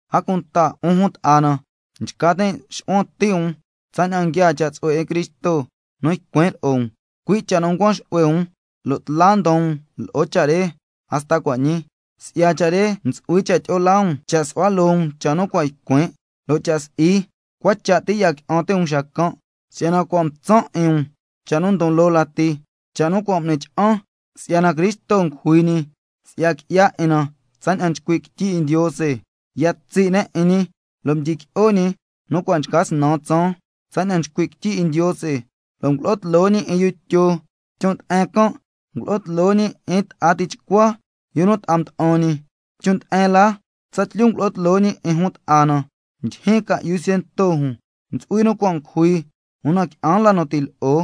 A cunta 'un jun ta'a na, nchca tin' xu'huan ti' um tsaña'an nguiaa cha' tsu'hue 'in Cristo nu ycuin' lo'o um, cui' cha' nu ncuan xu'hue um, lo' tla ndon um lo'o cha' re hasta cua' ñii. Si'ya cha' re ntsu'hui cha' tyi'o laa um, cha' su'hua loo um cha' nu cua' ycuin', lo' cha' si'i, cua cha' ti ya qui'an ti' um xacan'. Si'yana cua' mtsan' 'in um cha' nu ndon loo lati, cha' nu cua' m'ni cha'an, si'yana Cristo ngujui ñi si'ya qui'ya 'in na, tsaña'an nchcui' quityi 'in Ndiose, ya tsi' ne' 'in ñi lo' mdyiqui'o ñi nu cua' ca snan tsaan, tsaña'an nchcui' quityi 'in Ndiose, lo' ngulo'o tloo ñi 'in yu Tyo, chon' nde'en can' ngulo'o tloo ñi 'in ta'a tichcua yu nu ta'a mda'an ñi. Chon' nde'en la tsatlyu ngulo'o tloo ñi 'in jun ta'a na, ndyijyi ca'yu ciento jun, ntsu'hui nu cua' ngujui, una qui'an la nu ti' lo'o.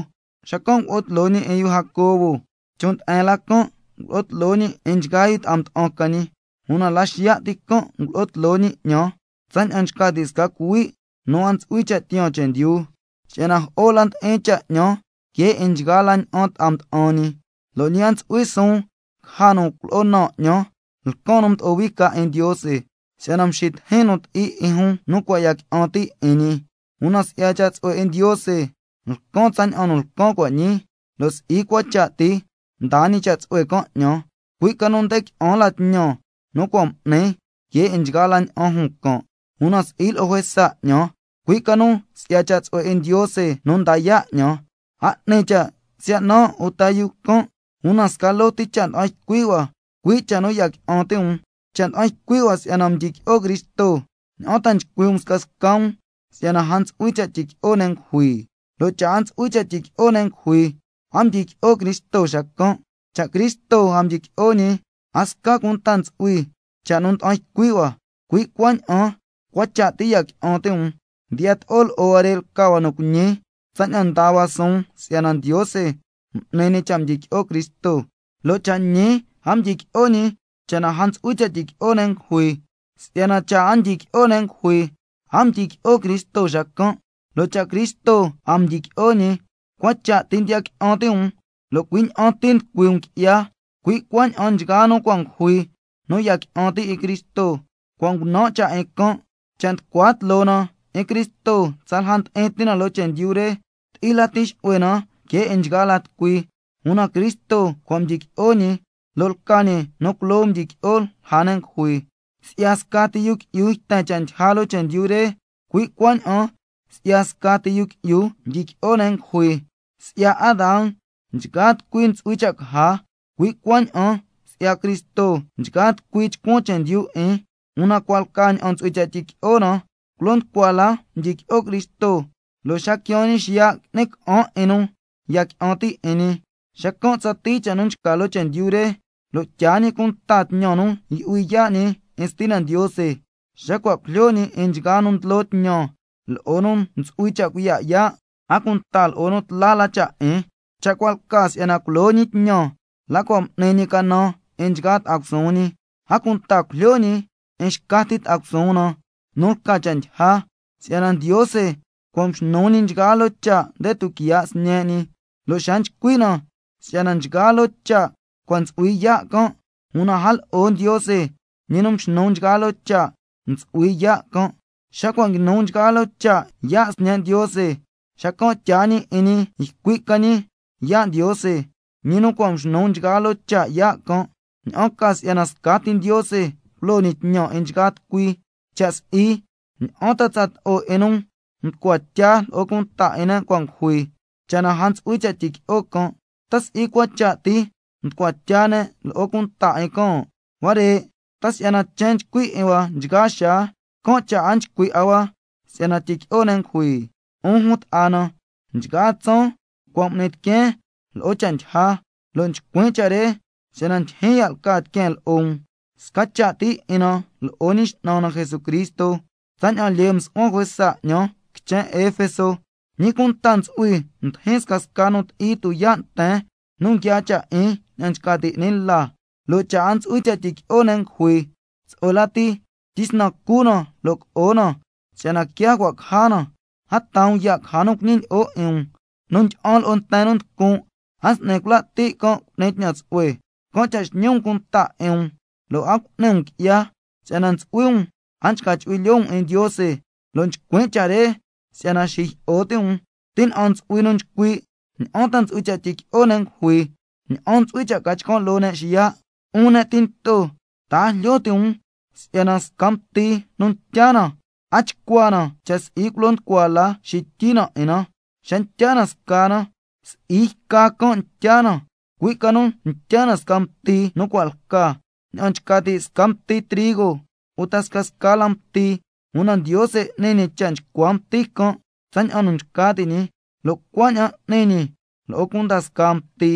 Xacan' ngulo'o tloo ñi 'in yu Jacobo, chon' nde'en la can' ngulo'o tloo ñi 'in nchgaa yu ta'a mda'an ca ñi, una la xiya' ti can' ngulo'o tloo ñi 'ñan, tsaña'an nchca ti' sca cuhui' nu a ntsu'hui cha' tiyaan chendyu. Si'yana jo'o la ndi'in cha' 'ñan que 'in nchgaa la ña'an ta'a mda'an ñi, lo' ñi a ntsu'hui suun caja nu culo'o naan 'ñan lcan nu mdo'o hui ca 'in Ndiose, si'yana mxitijin nu ti'i 'in jun nu cua' ya qui'an ti' 'in ñi. Una si'ya cha' tsu'hue 'in Ndiose lcan tsaña'an nu lcan cua' ñii, lo' si'i cua cha' ti mdaa ñi cha' tsu'hue can' 'ñan, cui' ca nu nde qui'an la tñan nu cua' m'nin que 'in nchgaa la ña'an jun can', una si'i lo'o juesa 'ñan, cui' ca nu si'ya cha' tsu'hue 'in Ndiose nu nda yaa' 'ñan. A 'ni cha' siya' nan' uta jun can', una sca loo ti cha' nda'an ycui' hua, cui' cha' nu ya qui'an ti' um. Cha' nda'an ycui' hua si'yana mdyiqui'o Cristo, ¿ña'an ta nchcui' um scasca um si'yana a ntsu'hui cha' tyiqui'o ne' ngujui? Lo' cha' a ntsu'hui cha' tyiqui'o ne' ngujui, a mdyiqui'o Cristo xacan'. Cha' Cristo a mdyiqui'o ñi, a sca cunta ntsu'hui cha' nu nda'an ycui' hua, cui' cuaña'an cua cha' ti ya qui'an ti' um. Ndiyato'o lo'o huare' lca hua nu cuiñi tsaña'an ndaa hua suun si'yana Ndiose m'ni ñi cha' mdyiqui'o Cristo. Lo' cha' ñi a mdyiqui'o ñi cha' na a ntsu'hui cha' tyiqui'o ne' ngujui. Si'yana cha' a ndyiqui'o ne' ngujui, a mdyiqui'o Cristo xacan', lo' cha' Cristo a mdyiqui'o ñi, cua cha' ti ndiya qui'an ti' um, lo' cui' ña'an ti nducui um qui'ya. Cui' cuaña'an nchgaa nu cua' ngujui nu ya qui'an ti' 'in Cristo, cua' ngunan' cha' 'in can'. Cha' nducua tloo na 'in Cristo tsalja ndi'in ti na loo chendyu re, ti'i lati xu'hue na que 'in nchgaa la tucui. Una Cristo cua' mdyiqui'o ñi, lo' lca ñi nu culoo mdyiqui'o lja ne' ngujui. Si'ya scati yu qui'yu yten cha' ndyija loo chendyu re, cui' cuaña'an si'ya scati yu qui'yu ndyiqui'o ne' ngujui. Si'ya Adán nchgaa tucui ntsu'hui cha' caja, cui' cuaña'an si'ya Cristo, nchgaa tucui chcuan chendyu 'in. Una cua' lca ña'an ntsu'hui cha' tyiqui'o na: Culo nducua la mdyiqui'o Cristo, lo' xa quiaan ñi xiya' qui'ni ca'an 'in nu ya qui'an ti' 'in ñi. Xacan' tsatii cha' nu nchca loo chendyu re, tyaa ñi cunta tñan nu yu'hui yaa' ñi 'in Stina Ndiose, xa cua' ngujlyo ñi 'in nchgaa nu ndlo tñan, lo'o nu ntsu'hui cha' cuiya' yaa', a cunta lo'o nu tla la cha' 'in. Cha' cua' lca si'yana culo ñi tñan la cua' m'ni ñi canan 'in nchgaa ta'a cusuun ñi. A cunta cujlyo ñi 'in xca ti ta'a cusuun na nu lca cha' ndyija. Si'yana —Ndiose cua' mxnu ñi nchgaa loo cha' nde tuquiya' Sñe' ñi—. Lo' xa nchcui' na si'yana nchgaa loo cha' cua' ntsu'hui yaa' can', una a lo'o Ndiose, ñi nu mxnu nchgaa loo cha', ntsu'hui yaa' can'. Xa cua' nguinu nchgaa loo cha' yaa' Sñe' Ndiose, xacan' tyaa ñi 'in ñi ycui' ca ñi yaa' Ndiose, ñi nu cua' mxnu nchgaa loo cha' yaa' can', ña'an ca si'yana scati Ndiose culo ñi tñan 'in nchgaa tucui. Cha' si'i, ¿ña'an ta tsato'o 'in nu nchcua tya lo'o cunta 'in ne' cua' ngujui, cha' na a ntsu'hui cha' tyiqui'o can'? ¿Ta si'i cua cha' ti nchcua tya ne' lo'o cunta 'in can'? Huare', ¿ta si'yana chen chcui 'in hua nchgaa xaa, can' cha' a chcui' 'a hua si'yana tyiqui'o ne' ngujui? 'Un jun ta'a na, nchgaa tsaan cua' m'nin tiqueen lo'o cha' ndyija, lo' nchcuin' cha' re si'yana ndyijyin ya' lca tiqueen lo'o um, sca cha' ti 'in na lo'o Ñi X'nan na Jesucristo. Tsaña'an lyee msu'huan juesa 'ñan quichen Efeso, ¿ñi cunta ntsu'hui mdijin scasca nu ti'i tuyaa' nten nu nguiaa cha' 'in ña'an nchca ti' 'ni la? Lo' cha' a ntsu'hui cha' tyiqui'o ne' ngujui, —tsu'hue lati tyisnan cu na lo' co'o na, si'yana quia cua' caja na—. A taa um ya' caja nu cuñilyi'o 'in um: Nu ndyi'an lo'o nten nu nducun' a s'ni cula' ti' can' cu'ni tñan tsu'hue. Can' cha' xñi um cunta 'in um lo' a cu'ni um qui'ya, si'yana ntsu'hui um a nchca chu'hui lyoo um 'in Ndiose, lo' nchcuin' cha' re si'yana xijyi'o ti' um. Tina'an ntsu'hui nu nchcui': ¿Ña'an ta ntsu'hui cha' tyiqui'o ne' ngujui? ¿Ña'an ntsu'hui cha' ca chcan' loo ne' xiya'? 'Un ne' tinto, ta a jlyo ti' um si'yana sca mti nu ntya na, a chcua na cha' si'i culo nducua la xityi na 'in na. Xa ntya na sca na, si'i yca can' ntya na, cui' ca nu ntya na sca mti nu cua' lca, ña'an nchca ti' sca mti trigo uta scasca la mti, una Ndiose n'ni ñi cha' nchcua mti can' tsaña'an nu nchca ti' ñi, lo' cuaña'an n'ni ñi lo'o cunda scaa mti.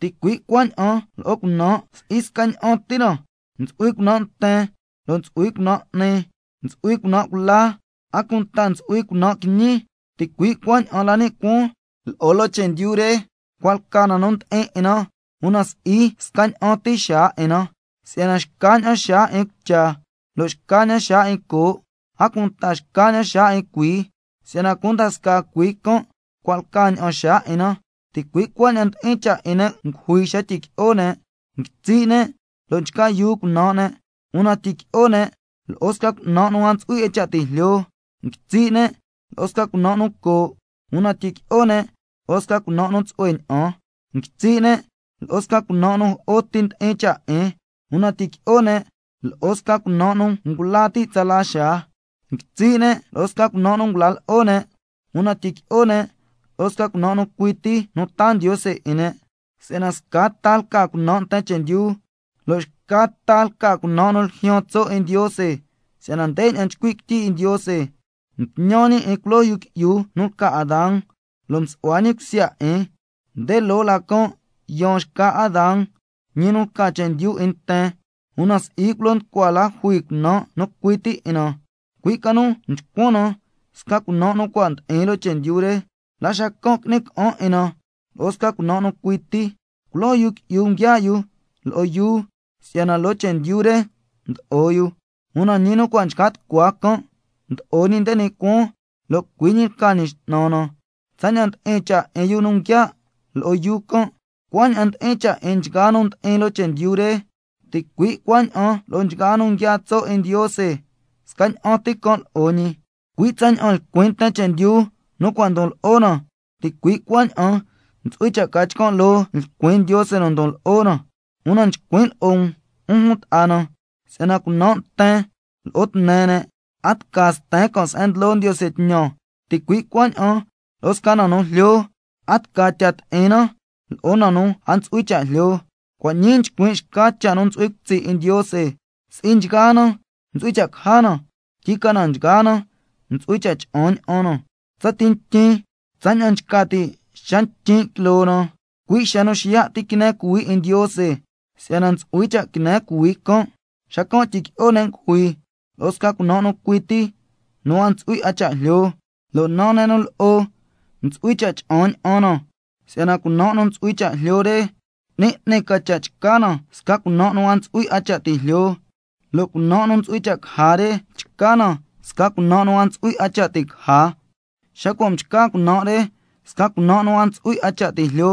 Ticui' cuaña'an lo'o cunan', si'i scaña'an ti na: Ntsu'hui cunan' nten lo' ntsu'hui cunan' 'ni, ntsu'hui cunan' cula, a cunta ntsu'hui cunan' quiñi. Ticui' cuaña'an la ni' cuaan lo'o chendyu re, cua' lca na nu ndi'in 'in na, una si'i scaña'an ti xaa 'in na. Si'yana xcaña'an xaa 'in cucha, lo' xcaña'an xaa 'in coo', a cunta xcaña'an xaa 'in cuii, si'yana cunda scaa cuii can' cua' lca ña'an xaa 'in na. Ticui' cuaña'an ndi'in cha' 'in ne' ngujui xa tyiqui'o ne', nguitsi' ne' lo' nchca yuu cunan' ne', una tyiqui'o ne' lo'o sca cunan' nu a ntsu'hui 'a cha' ti' jlyo. Nguitsi' ne' lo'o sca cunan' nu coo', una tyiqui'o ne' lo'o sca cunan' nu tsu'hue ña'an. Nguitsi' ne' lo'o sca cunan' nu jo'o ti ndi'in cha' 'in, una tyiqui'o ne' lo'o sca cunan' nu ngula ti' tsala xaa. Nguitsi' ne' lo'o sca cunan' nu ngula lo'o ne', una tyiqui'o ne' lo'o sca cunan' nu cui ti nu taa Ndiose 'in ne'. Si'yana sca ta lca cunan' nten chendyu, lo' xca ta lca cunan' nu ljyaan tso' 'in Ndiose. Si'yana ndeña'an nchcui' quityi 'in Ndiose: —Mtñan ñi 'in culoo yu qui'yu nu lca Adán, lo' msu'hua ñi cusya 'in—, nde loo la can' yaan xca Adán, ñi nu lca chendyu 'in nten. Una si'i culo nducua la jui cunan' nu cui ti 'in na, cui' ca nu mchcuan na sca cunan' nu cua' ndi'in loo chendyu re, la xacan' qui'ni ca'an 'in na lo'o sca cunan' nu cui ti. Culoo yu qui'yu nguiaa' lo'o yuu si'yana loo chendyu re mdo'o yu, una ñi nu cua' nchca tucua can' mdo'o ñi nde ni' cuaan, lo' cui' ñi lca Ñi X'nan na. Tsaña'an ndi'in cha' 'in yu nu nguiaa' lo'o yuu can', cuaña'an ndi'in cha' 'in nchgaa nu ndi'in loo chendyu re. Ticui' cuaña'an lo'o nchgaa nu nguiaa tso' 'in Ndiose, scaña'an ti can' lo'o ñi. Cui' tsaña'an lcuin nten chendyu nu cua' ndon lo'o na, ticui' cuaña'an ntsu'hui cha' ca chcan' loo lcuin Ndiose nu ndon lo'o na. Una chcuin' lo'o um, 'un jun ta'a na, si'yana cunan' nten lo'o tne ne' a tca sten can' se'en ndlo Ndiose tñan, ticui' cuaña'an lo'o sca na nu jlyo, a tca tyaa ti'in na lo'o na nu a ntsu'hui cha' jlyo. Cua' ñii chcuin' xca cha' nu ntsu'hui cutsi' 'in Ndiose, si'i nchgaa na ntsu'hui cha' caja na, tyicana nchgaa na ntsu'hui cha' cha'an ña'an na, tsati ntyin, tsaña'an nchca ti' xa ntyin' quiloo na, cui' xa nu xiya' ti quine cuhuii 'in Ndiose. Si'yana ntsu'hui cha' quine cuhuii can', xacan' tyiqui'o ne' ngujui lo'o sca cunan' nu cui ti nu a ntsu'hui 'a cha' jlyo, lo' naa ne' nu lo'o ntsu'hui cha' cha'an ña'an na. Si'yana cunan' nu ntsu'hui cha' jlyo re 'ni 'ni ca cha' chca na sca cunan' nu a ntsu'hui 'a cha' ti' jlyo, lo' cunan' nu ntsu'hui cha' caja re chca na sca cunan' nu a ntsu'hui 'a cha' ti' caja. Xa cua' mchca cunan' re sca cunan' nu a ntsu'hui 'a cha' ti' jlyo,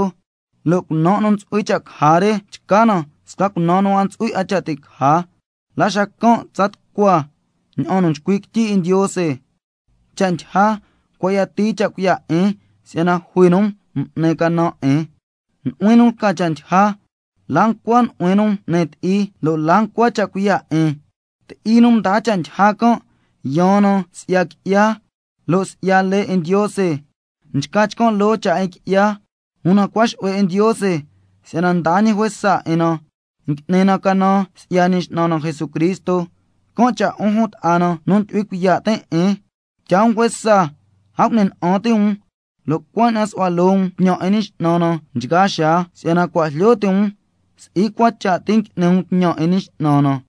lo' cunan' nu ntsu'hui cha' caja re chca na sca cunan' nu a ntsu'hui 'a cha' ti' caja, la xacan' tsa tucua ña'an nu nchcui' quityi 'in Ndiose: —Cha' ndyija cua' yatii cha' cuiya' 'in si'yana jui nu m'ni canan 'in. Nu'huin nu lca cha' ndyija, ¿la ncua nu'huin nu m'ni ti'i? ¿Lo' la ncua cha' cuiya' 'in—? Ti'i nu ndaa cha' ndyija can' yaan na si'ya qui'ya nu nducui nten, lo' si'ya lee 'in Ndiose, can' cha' nducui ne' qui'ya. Una cua' xu'hue 'in Ndiose si'yana ndaa ñi juesa 'in na, ngui'ni na canan si'ya Ñi X'nan na Jesucristo. Can' cha' 'un jun ta'a na nu ndyu'hui cuiya' tin' 'in, tyaa um juesa, a cu'ni na'an ti' um, lo' cuaña'an su'hua loo um tñan 'in Ñi X'nan na nchgaa xaa, si'yana cua' jlyo ti' um si'i cua cha' ti ngui'ni um tñan 'in Ñi X'nan na.